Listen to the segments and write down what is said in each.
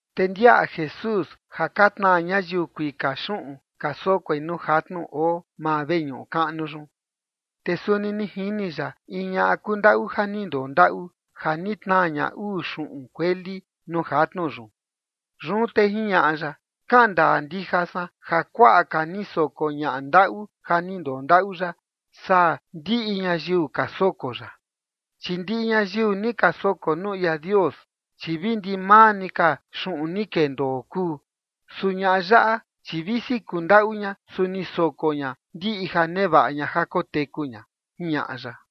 Te ndiaꞌa Jesús ja ka tnaa ñayiu kuika xuꞌun ka sokoi nuu jatnu oo maa veñuꞌu kaꞌnu yun. Te suni ni jini ya in ñaꞌa kundaꞌu ja ni ndondaꞌu, ja ni tnaa ña uu xuꞌun kueli nuu jatnu yun. Yun te jiñaꞌa ya: ―Kaꞌan ndaa ndija san ja kuaꞌa ka ni soko ñaꞌa ndaꞌu ja ni ndondaꞌu yaꞌa saa ndiꞌi ñayiu ka soko yaꞌa. Chi ndiꞌi ñayiu ni ka soko nuu ia Dios, chi vi ndimaa ni ka xuꞌun ni kendoo kuu. Su ñaꞌa yaꞌa, chi visi kundaꞌu ña, su ni soko ña ndiꞌi ja nevaꞌa ña ja koteku ña ―jiñaꞌa ya.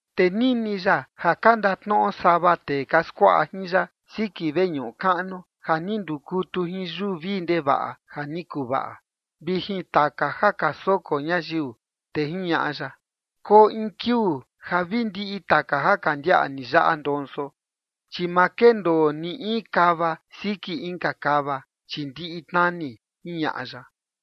Te nini ya ja ka ndatnoꞌo sava tee ka skuaꞌa jin ya siki veñuꞌu kaꞌnu ja ni ndukutu jin yuu vii ndevaꞌa ja ni kuvaꞌa, vi jin taka ja ka soko ñayiu, te jiñaꞌa ya: ―Koo in kiuu ja vi ndiꞌi taka ja ka ndiaꞌa ni yaꞌa ndonso, chi ma kendoo ni in kava siki inka kava, chi ndiꞌi tnani ―jiñaꞌa ya.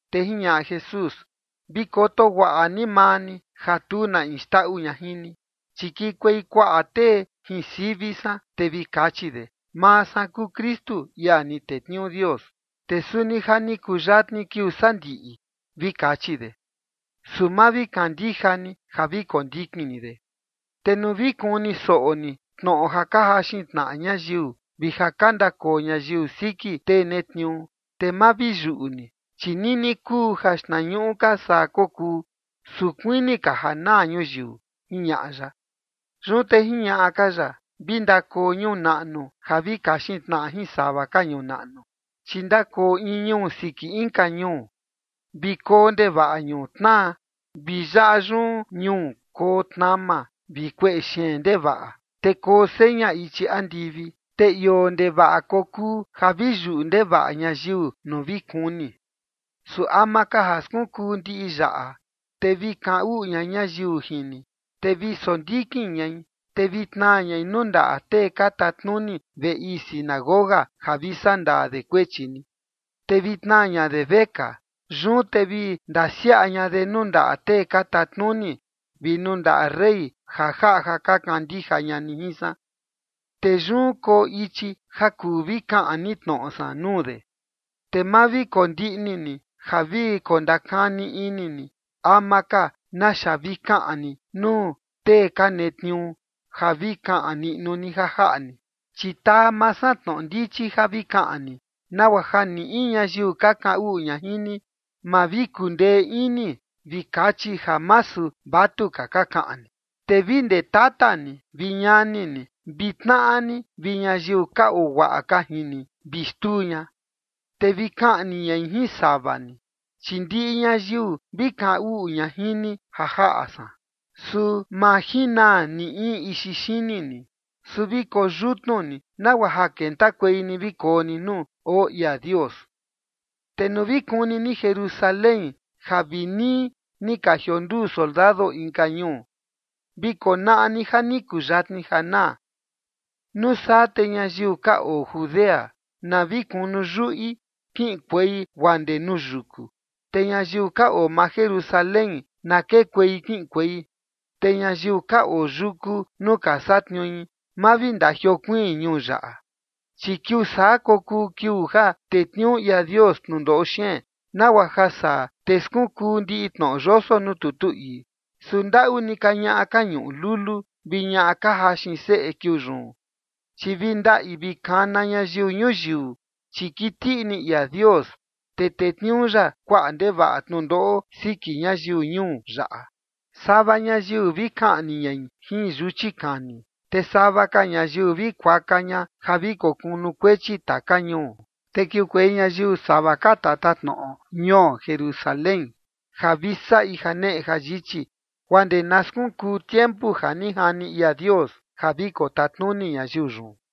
Te jiñaꞌa Jesús: ―Vi koto guaꞌa ni maa ni ja tu na in xndaꞌu ña jin ni. Chi kikuei kuaꞌa tee jin sivi san, te vi kachi de: “Maa san kuu Kristu, ia ni tetniuu Dios”, te suni “Ja ni kuyatni kiuu sandiꞌi”, vi kachi de. Su ma vi kandija ni ja vi kondikin ni de. Te nuu vi kuni soꞌo ni tnoꞌo ja ka jaxin tnaꞌa ñayiu vi ja ka ndakoo ñayiu siki tee netniuu, te ma vi yuꞌu ni, chi nini kuu ja xtnañuꞌu ka saa kokuu, su kuini ka ja naa ñuyiu ―jiñaꞌa ya. Yun te jiñaꞌa ka ya: ―Vi ndakoo ñuu naꞌnu ja vi kaxin tnaꞌa jin sava ka ñuu naꞌnu, chi ndakoo in ñuu siki inka ñuu. Vi koo ndevaꞌa ñuu tnaa, vi yaꞌa yun ñuu koo tnama vi kueꞌe xeen ndevaꞌa, te koo seña ichi andivi, te ioo ndevaꞌa kokuu ja vi yuꞌu ndevaꞌa ñayiu nuu vi kuni. ’Su ama ka ja skunkuu ndiꞌi yaꞌa, te vi kaꞌan uꞌu ña ñayiu jin ni, te vi sondikin ñai, te vi tnaa ñai nuu ndaꞌa tee ka tatnuni veꞌe ii sinagoga ja vi saꞌa ndaa de kuechi ni, te vi tnaa ña de vekaa. Yun te vi ndasiaꞌa ña de nuu ndaꞌa tee ka tatnuni vi nuu ndaꞌa rey ja jaꞌa ja ka kandija ña ni jin san. Te yun koo ichi ja kuu vi kaꞌan ni tnoꞌo san nuu de. Te ma vi kondiꞌni ni ja vi kondakani ini ni ama ka naxa vi kaꞌan ni nuu tee ka netniuu ja vi kaꞌan niꞌnu ni ja jaꞌa ni. Chi taa maa san tnoꞌo ndichi ja vi kaꞌan ni, nagua ja ni in ñayiu ka kaꞌan uꞌu ña jin ni, ma vi kundee ini vi kachi ja masu vatuka ka kaꞌan ni. Te vi ndee tata ni vi ñani ni vi tnaꞌa ni vi ñayiu ka oo guaꞌa ka jin ni, vi xtuu ña. Te vi kaꞌni ñai jin sava ni. Chi ndiꞌi ñayiu vi kaꞌan uꞌu ña jin ni ja jaꞌa san. Su ma jinaa ni in ixi xini ni. Su vi koyutnu ni nagua ja kentakuei ni vi koo ni nuu oo ia Dios. ’Te nuu vi kuni ni Jerusalén ja vi nii ni ka jikonduu soldado inka ñuu, vi konaꞌa ni ja ni kuyatni ja naa. Nuu saa te ñayiu ka oo Judea, na vi kunu yuꞌi kiꞌinkuei guaa ndee nuu yuku. Te ñayiu ka oo maa Jerusalén, na kekuei kiꞌinkuei. Te ñayiu ka oo yuku nuu ka satniui, ma vi ndajiokuiin ñuu yaꞌa. Chi kiuu saa kokuu kiuu ja tetniuu ia Dios tnundoꞌo xeen, nagua ja saa, te skunkuu ndiꞌi tnoꞌo yoso nuu tutu ii. Su ndaꞌu ni ka ñaꞌa ka ñuꞌu lulu vi ñaꞌa ka jaxin seꞌe kiuu yun, chi vi ndaꞌi vi kana ñayiu ñuyiu, chi kiti ini ia Dios, te tetniuu ya kuaꞌa ndevaꞌa tnundoꞌo siki ñayiu ñuu yaꞌa. Sava ñayiu vi kaꞌni ñai jin yuchi kani, te sava ka ñayiu vi kuaka ña ja vi kokunukuechi taka ñuu. Te kiukuei ñayiu sava ka tatatnoꞌo ñuo Jerusalén ja vi saꞌi janeꞌe jayichi, guaa ndee na skunkuu tiempu ja ni jani ia Dios ja vi kotatnuni ñayiu yun.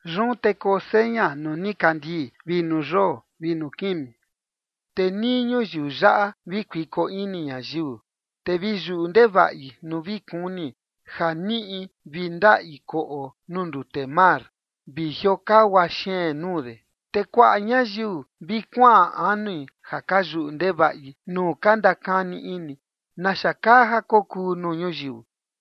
’Yun te koo seña nuu nikandii, vi nuu yoo vi nuu kimi. Te nii ñuyiu yaꞌa vi kuiko ini ñayiu, te vi yuꞌu ndevaꞌi nuu vi kuni ja niꞌi vi ndaꞌi koꞌo nuu ndute mar vi jiokagua xeen nuu de. Te kuaꞌa ñayiu vi kuaꞌan anui ja ka yuꞌu ndevaꞌi nuu ka ndakani ini naxa kaa ja kokuu nuu ñuyiu,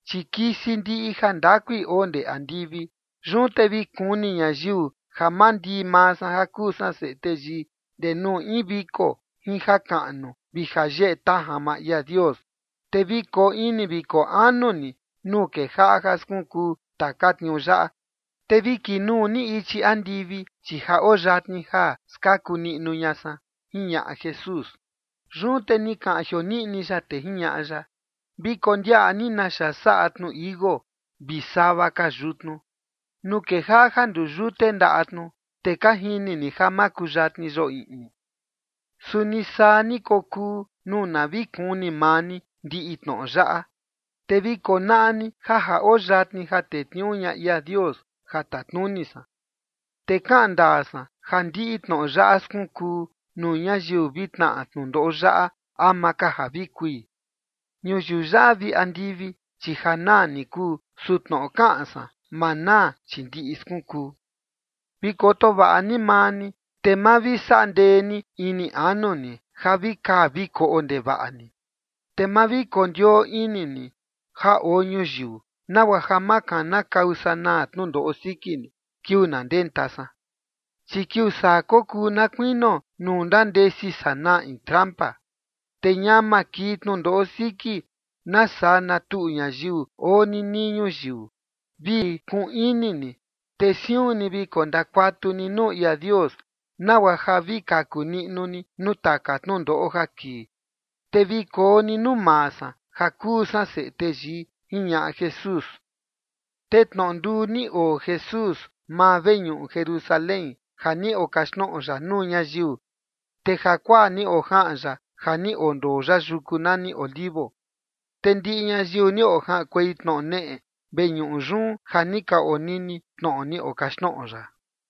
chi kisi ndiꞌi jandakui oo ndee andivi. Yun te vi kuni ñayiu ja mandii maa san, ja kuu san Seꞌe Teyii, ndee nuu in viko jin jakaꞌnu vi jayeꞌe tajan maa ia Dios. Te vi koo ini vi koo anu ni nuu kejaꞌa ja skunkuu taka tniuu yaꞌa. Te vi kinuu ni ichi andivi, chi ja oo yatni ja skaku niꞌnu ña san ―jiñaꞌa Jesús. Yun te ni kaꞌan jioniꞌni ya, te jiñaꞌa ya: ―Vi kondiaꞌa ni naxa saꞌa tnu tichi iuu vi sava ka yutnu. Nuu kejaꞌa ja nduyute ndaꞌa tnu, te ka jini ni ja ja makuyatni yoo iꞌni. Suni saa ni kokuu nuu na vi kuni maa ni ndiꞌi tnoꞌo yaꞌa, te vi konaꞌa ni ja ja oo yatni ja tetniuu ña ia Dios ja tatnuni san. ’Te kaꞌan ndaa san ja ndiꞌi tnoꞌo yaꞌa skunkuu nuu ñayiu vi tnaꞌa tnundoꞌo yaꞌa ama ka ja vi kui. Ñuyiu yaꞌa vi andivi, chi ja naa ni kuu. Su tnoꞌo kaꞌan san, ma naa, chi ndiꞌi skunkuu. ’Vi koto vaꞌa ni maa ni, te ma vi saꞌa ndee ni ini anu ni ja vi kaa vi koꞌo ndevaꞌa ni, te ma vi kondioo ini ni ja oo ñuyiu, nagua ja ma kanakau sanaa tnundoꞌo siki ni kiuu na ndenta san. Chi kiuu saa kokuu na kuinio nuu ndandesi sanaa in trampa. Te ñama kii tnundoꞌo siki na saa na tuꞌu ñayiu oo ninii ñuyiu. Vi kuꞌun ini ni, te siun ni vi kondakuatu ni nuu ia Dios, nagua ja vi kaku niꞌnu ni nuu taka tnundoꞌo ja kii, te vi koo ni nuu maa san, ja kuu san Seꞌe Teyii ―jiñaꞌa Jesús. Te tnoꞌo nduu ni oo Jesús maa veñuꞌu Jerusalén ja ni okaxtnoꞌo ya nuu ñayiu, te jakuaa ni ojaꞌan ya ja ni ondoo ya yuku nani Olivos. Te ndiꞌi ñayiu ni ojaꞌankuei tnoꞌo neꞌe veñuꞌu yun ja ni ka onini tnoꞌo ni okaxtnoꞌo ya.